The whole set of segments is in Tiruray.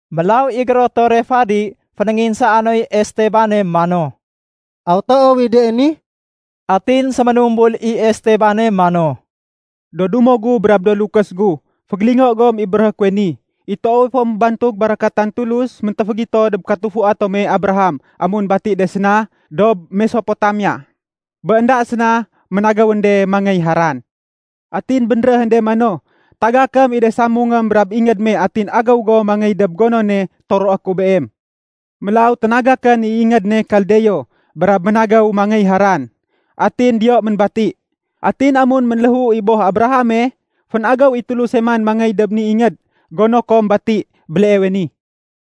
Mélaw i gérotore fadi fénénginsaa noy Estebane mano, “Aw toow i de ni?” Atin séménumbul i Estebane mano, “Do dumo gu brab do lukés gu, fégélingo gom i béréhé kuwe ni. I toowe fo ménbantug barakatan Tulus méntéfégito dob katufua tome Abraham amun bati de séna dob Mesopotamia, bé énda séna ménagéwén de mangéy Haran. Atin bénréhén de mano, ‘Tagakém i de samungém brab ingéd me atin agéw go mangéy dob gonone toroé ku beem.’ Mélaw ténagakén i ingéd ne Kaldeo brab ménagéw mangéy Haran, atin diyo ménbati. Atin amun ménléhu i boh Abrahame, fénagéw i Tuluse man mangéy dob ni ingéd gono kom bati béleewe ni.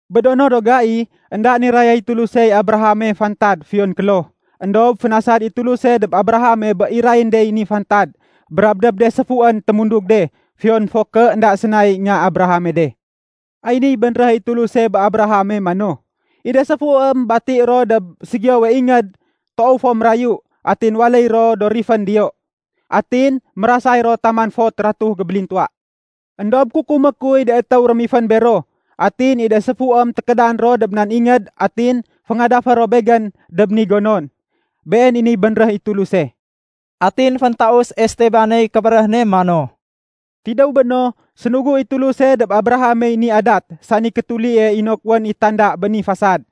Bé do no do gai, énda nirayay Tulusey Abrahame fantad fiyon kloh. Endob fénasad i Tuluse dob Abrahame bé irayén dey ni fantad brab dob de séfuén témundug de, fiyon fo ké énda sénay nga Abrahame de. Ay niy bénréh i Tuluse bé Abrahame mano, ‘I de séfuém bati ro dob ségiyowe ingéd toow fo mérayu atin waléy ro do rifén diyo. Atin mérasay ro taman fot ratuh gébélintuwa. Endob kukumé kuy de étéw rémifén bero. Atin i de séfuém tékédan ro dob nan ingéd atin féngadafé ro Begén dob ni gonon.’ Been i niy bénréh i Tuluse.” Atin féntaus Estebaney kébéréh ne mano, “Tidéw béno, sénugu i Tuluse dob Abrahamey ni adat sani kétulie inok wén i tanda bé ni fasad.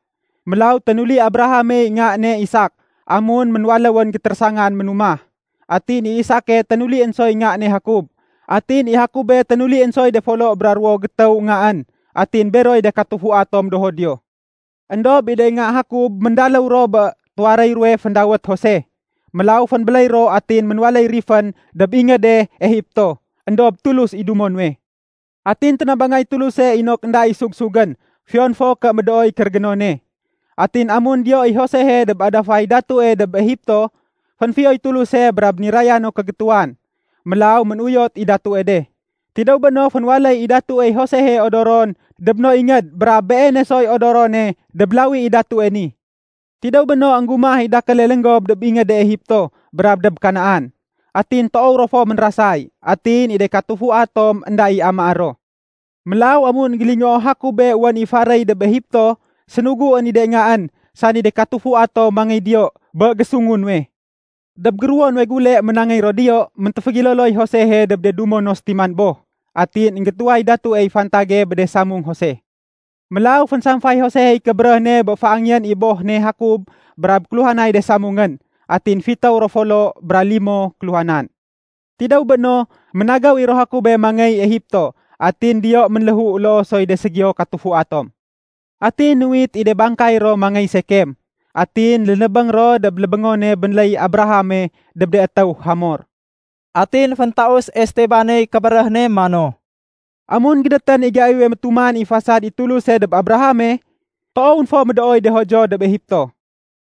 Mélaw ténuli Abrahamey nga ne Isak amun ménwaléwén gétérésangan ménumah. Atin i Isake ténulién soy nga ne Jakob. Atin i Jakobe ténulién soy de folo bra ruwo gétéw ngaén. Atin beroy de katufua tom do Judio. “Endob i de nga Jakob méndaléw ro bé tuwaréy ruwe féndawét Jose. Mélaw fénbéléy ro atin ménwaléy rifén dob ingéde Egipto. Endob Tulus i dumo nuwe. Atin ténabangay Tuluse inok énda i sug-sugén fiyon fo ké médooy kérégénone. Atin amun diyo i Josehe dob adafay datue dob Egipto, fénfiyoy Tuluse brab niraya no kégétuwan. Mélaw ménuyot i datue de. Tidéw béno fénwaléy i datuey Josehe odoron dob no ingéd brab beene soy odorone dob lawi i datue ni. Tidéw béno, énggumah i dakéle lénggob dob ingéde Egipto brab dob Kanaan. Atin toow ro fo ménrasay. Atin i de katufua tom énda i amaé ro. Mélaw amun énggélingoo Jakobe wén i faréy dob Egipto, sénuguén i de ngaén, sani de katufua tom mangéy diyo bé gésungu nuwe. Dob géruwo nuwe gule ménangéy ro diyo, méntéfégéloloy Josehe dob de dumo no sétiman boh. Atin énggétuway datuey fantage bé de samung Jose. Mélaw fénsamfay Josehey kébéréh ne bé féangéyén i boh ne Jakob brab kéluhanay de samungén. Atin fitéw ro folo bra limo kéluhanan. Tidéw béno, ménagéw i ro Jakobe mangéy Egipto. Atin diyo ménléhu loo soy de ségiyo katufua tom. Atin nuwit i de bangkay ro mangéy Sekem, atin lénébéng ro dob lébéngone bénléy Abrahame dob de étéw Hamor.” Atin féntaus Estebaney kébéréh ne mano, “Amun gédétén i gaiwe métuman i fasad i Tuluse dob Abrahame, toowén fo médooy de Judio dob Egipto.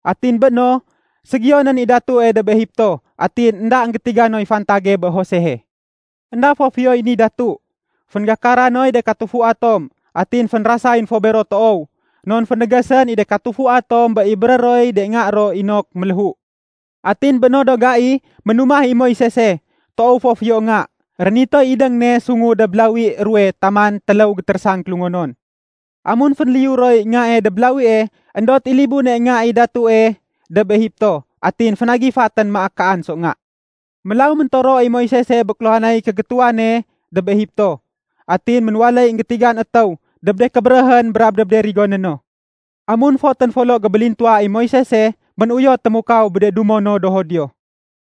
Atin bé béno, ségiyonén i datue dob Egipto, atin énda énggétiga noy fantage bé Josehe. Enda fo fiyoy ni datu. Fénggakara noy de katufua tom. Atin fénrasayén fo bero toow. Non fénégésén i de katufua tom bé ibéré roy de nga ro inok méléhu. Atin bé no do gai, ménumah i Moisese, toow fo fiyo nga. Rénitoy idéng ne sungu dob lawi ruwe taman téléw gétérésang kélungonon. Amun fénliyu roy ngae dob lawie, éndot i libune nga i datue dob Egipto. Atin fénagifatén maak kaan so nga. Mélaw méntoro i Moisese bé kéluhanay kégétuwane dob Egipto. Atin ménwaléy énggétigan étéw dob de kébéréhén brab dob de rigoné no. “Amun fotén folo gébélintuwa i Moisese, ménuyot témukaw bé de dumo no do Judio.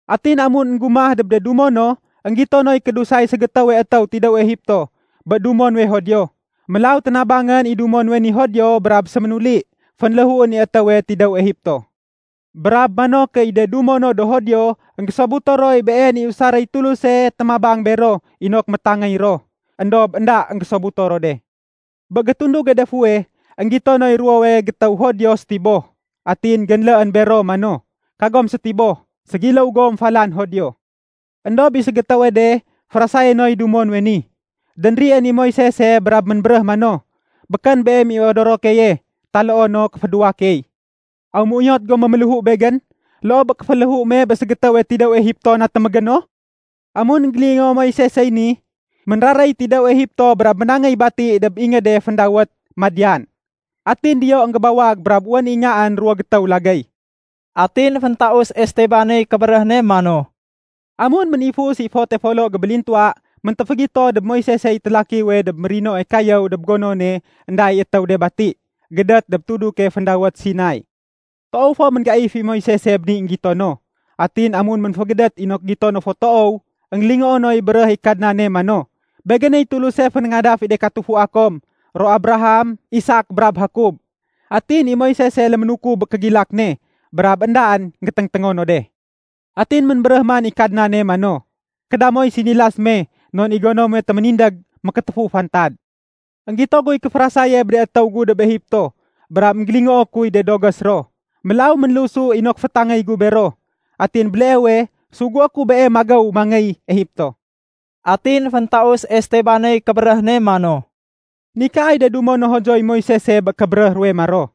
Atin amun énggumah dob de dumo no, énggito noy kédusay ségétéwe tidéw Egipto bé dumo nuwe Judio. Mélaw ténabangén i dumo nuwe ni Judio brab séménuli fénléhuén i étéwe tidéw Egipto. Brab mano ké i de dumo no do Judio énggésobuto roy been i usaréy Tuluse témabang bero inok métangéy ro. Endob énda énggésobuto ro de. Bé gétunduge de fuweh, énggito noy ruwowe gétéw Judio sétiboh. Atin génléén bero mano, ‘Kagom sétiboh! Ségiléw gom falan Judio.’ Endob i ségétéwe de férasayé noy dumo nuwe ni, dénrién i Moisese brab ménbéréh mano, ‘Békén beem i odoro keye taloo no kéfédéwa key. Aw méuyot go méméléhu begén loo bé kéféléhu me bé ségétéwe tidéw Egipto natémégéno?’ Amun énggélingoo Moisesey ni, ménraréy tidéw Egipto brab ménangéy bati dob ingéde féndawét Madian. Atin diyo énggébawag brab wén i ngaén ruwo gétéw lagéy.” Atin féntaus Estebaney kébéréh ne mano, “Amun ménifus i fote folo gébélintuwa, méntéfégito dob Moisesey télakiwe dob mérinoe kayéw dob gonone énda i étéw de bati, gédét dob tuduke féndawét Sinai. Toow fo ménggaif i Moisese bé ni énggito no. Atin amun ménfégédét inok gito no fo toow, énggélingoo noy béréh i Kadnane mano, ‘Begéney Tuluse fénéngadaf i de katufua kom, ro Abraham, Isak, brab Jakob.’ Atin i Moisese léménukub bé kégilak ne brab éndaén géténgténgo no de. Atin ménbéréh man i Kadnane mano, ‘Kéda moy sinilas me non i gono muwe témindég mékétéfu fantad. Enggito guy kéférasaye bé de étéw gu dob Egipto. Brab énggélingoo kuy de dogés ro. Mélaw ménlusu inok fétangéy gu bero. Atin béleewe, sugué ku beem magéw mangéy Egipto.’” Atin féntaus Estebaney kébéréh ne mano, “Nikaay de dumo no Judioy Moisese bé kébéréh ruwe maro,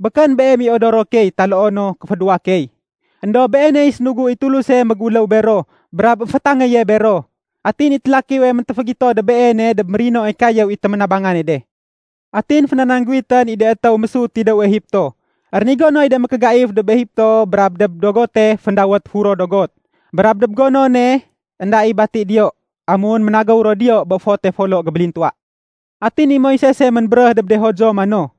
‘Békén beem i odoro key taloo no kéfédéwa key!’ Endob beeney sénugu i Tuluse méguléw bero brab émfétangéye bero. Atin i télakiwe méntéfégito dob beene dob mérinoe kayéw i téménabangane de. Atin fénanangguwitén i de étéw mésut tidéw Egipto. Rénigo noy de mékégaif dob Egipto brab dob dogote féndawét ‘Furo Dogot’ brab dob gonone énda i bati diyo amun ménagéw ro diyo bé fote folo gébélintuwa. Atin i Moisesey ménbéréh dob de Judio mano,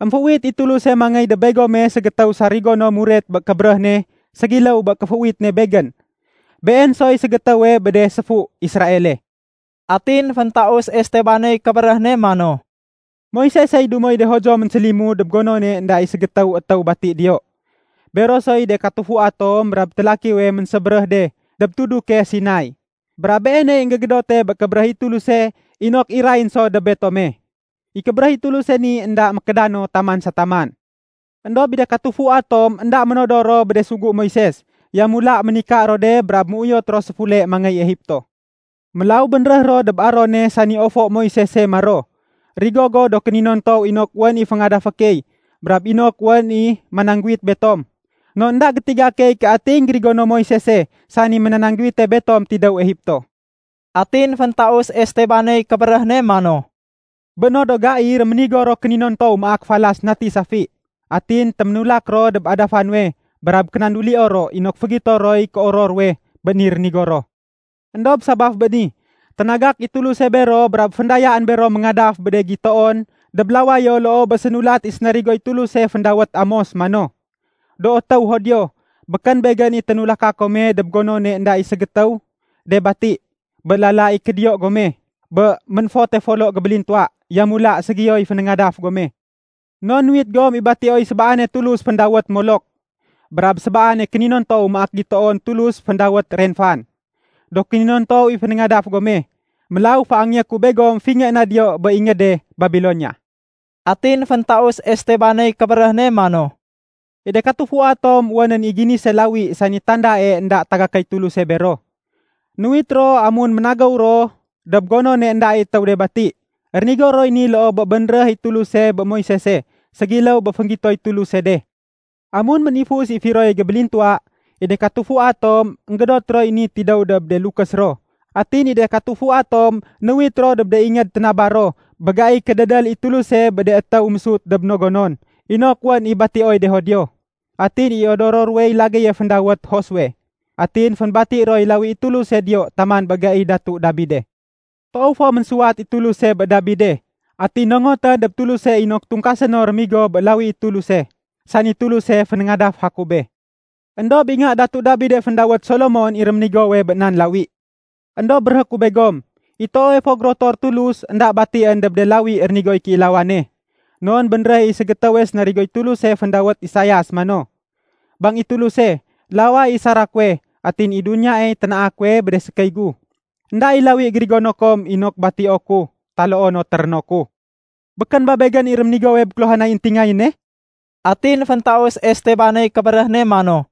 ‘Emféuwit i Tuluse mangéy dob begome ségétéw sarigo no muret bé kébéréh ne ségiléw bé kéféuwit ne begén. Been soy ségétéwe bé de séfu Israele.’” Atin féntaus Estebaney kébéréh ne mano, “Moisesey dumoy de Judio ménsélimud dob gonone énda i ségétéw étéw bati diyo, bero soy de katufua tom brab télakiwe ménsébéréh de dob tuduke Sinai. Brab beeney énggégédote bé kébéréh i Tuluse inok irayén so dob betome. I kébéréh i Tuluse ni énda mékéda no taman sa taman. “Endob i de katufua tom énda ménodor ro bé de sugu Moises. Yamula ménika ro de brab ménuyot ro séfule mangéy Egipto. Mélaw bénréh ro dob Arone sani ofo Moisese maro, ‘Rigo go do kéninontow inok wén i féngadafé key, brab inok wén i manangguwit betom. Non énda gétiga key ké ati énggérigono Moisese sani ménanangguwite betom tidéw Egipto.’” Atin féntaus Estebaney kébéréh ne mano, “Bé no do gai réménigo ro kéninontow maak falas nati safi. Atin téménulak ro dob adafa nuwe brab kénandulio ro inok fégito roy kéoror ruwe bé ni rénigo ro. Endob sabaf bé ni, ténagak i Tuluse bero brab féndayaén bero méngadaf bé de gitoon dob lawayo loo bé sénulat i sénarigoy Tuluse féndawét Amos mano, ‘Do étéw Judio, békén Begén i ténulaka kome dob gonone énda i ségétéw de bati bé lala i kédiyo gome bé ménfote folo gébélintuwa. Yamula ségiyoy fénéngadaf gome. Non nuwit gom i batioy sébaane tulus féndawét Molok brab sébaane kéninontow maak gitoon tulus féndawét Renfan. Do kéninontow i fénéngadaf gome, mélaw féangeyé ku begom fingé na diyo bé ingéde Babilonia.’” Atin féntaus Estebaney kébéréh ne mano, “I de katufua tom wénén i ginise lawi sani tandae énda tagakéy Tuluse bero. Nuwit ro amun ménagéw ro dob gonone énda i étéw de bati. Rénigo roy ni loo bé bénréh i Tuluse bé Moisese, ségiléw bé fénggitoy Tuluse de. Amun ménifus i firoye gébélintuwa, i de katufua tom énggédot roy ni tidéw dob de lukés ro. Atin i de katufua tom nuwit ro dob de ingéd ténaba ro bé gaiy kédédél i Tuluse bé de étéw mésut dob do no gonon inok wén i batioy de Judio. Atin i odoro ruwey lagéye féndawét Josue. Atin fénbati roy lawi i Tuluse diyo taman bé gai Datu Dabide. Toow fo ménsuwat i Tuluse bé Dabide. Atin nongotén dob Tuluse inok tungkasé no rémigo bé lawi i Tuluse, sani Tuluse fénéngadaf Jakobe. Endob i nga Datu Dabide féndawét Solomon i réménigowe bé nan lawi. “Endob béréhé ku begom, i toowe fo gérotor Tulus énda batién dob de lawi rénigoy kéilawane. Non bénréh i ségétéwe sénarigoy Tuluse féndawét Isias mano, ‘Bang i Tuluse, laway i sara kuwe, atin i duniyaey ténaa kuwe bé de sékéy gu. Enda i lawi gérigono kom inok batio ku taloo no téréno ku. Békén ba Begén i réménigowe bé kéluhanay éntingayéne?’” Atin féntaus Estebaney kébéréh ne mano,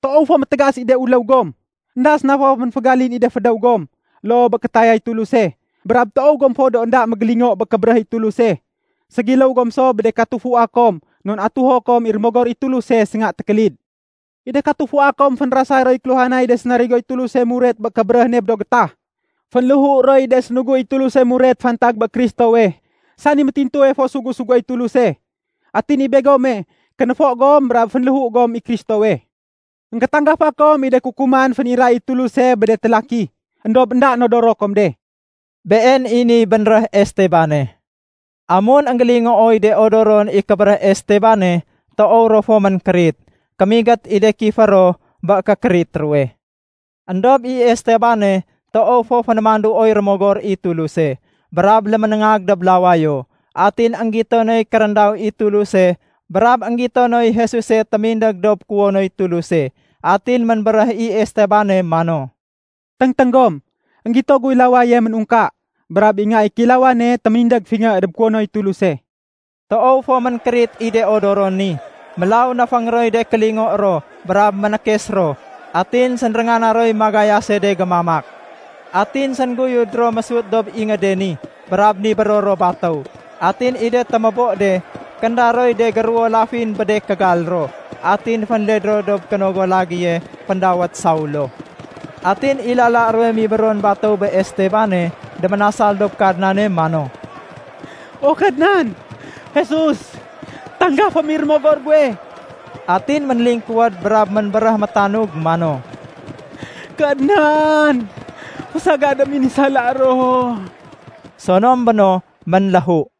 “Toow fo métégas i de uléw gom! Enda séna fo ménfégalin i de fédéw gom loo bé kétayay Tuluse. Brab toow gom fo do énda mégélingo bé kébéréh i Tuluse. Ségiléw gom so bé de katufua kom non atuho kom i Rémogor i Tuluse sénga tékélid. I de katufua kom fénrasay roy kéluhanay de sénarigoy Tuluse muret bé kébéréh ne bé do gétah. Fénléhu roy de sénugu i Tuluse muret fantag bé Kristowe sani métintuwe fo Sugu-suguéy Tuluse. Atin i begome, kénéfo gom brab fénléhu gom i Kristowe. Enggétanggafa kom i de kukuman féniray i Tuluse bé de télaki, éndob énda nodoro kom de.” Been i niy bénréh Estebane. Amun énggélingooy de odoron i kébéréh Estebane, toow ro fo ménkérit. Kémigét i de kifé ro bé kékérit ruwe. Endob i Estebane toow fo fénémanduoy Rémogor i Tuluse, brab léménéngag dob lawayo, atin énggito noy kéréndaw i Tuluse brab énggito noy Jesuse témindég dob kuwonoy Tuluse. Atin ménbéréh i Estebane mano, “Téngténg gom! Enggito guy lawayo ménungka, brab i Nga i Kéilawane témindég fingé dob kuwonoy Tuluse.” Toow fo ménkérit i de odoron ni, mélaw néféng roy de kélingo ro brab ménékes ro. Atin sénréngana roy magayase de gémamak. Atin séngguyud ro mésut dob ingéde ni brab nibéro ro batéw. Atin i de témébo de, kénda roy de géruwo lafin bé de kégal ro, atin fénled ro dob kénogo lagéye féndawét Saulo. Atin i lala ruwe mibéron batéw bé Estebane, déménasal dob Kadnane mano, “O Kadnan Jesus, tanggafém i rémogor guwe!” Atin ménlingkuwéd brab ménbéréh métanug mano, “Kadnan, fésagadém i ni sala ro.” Sonom béno, ménléhu.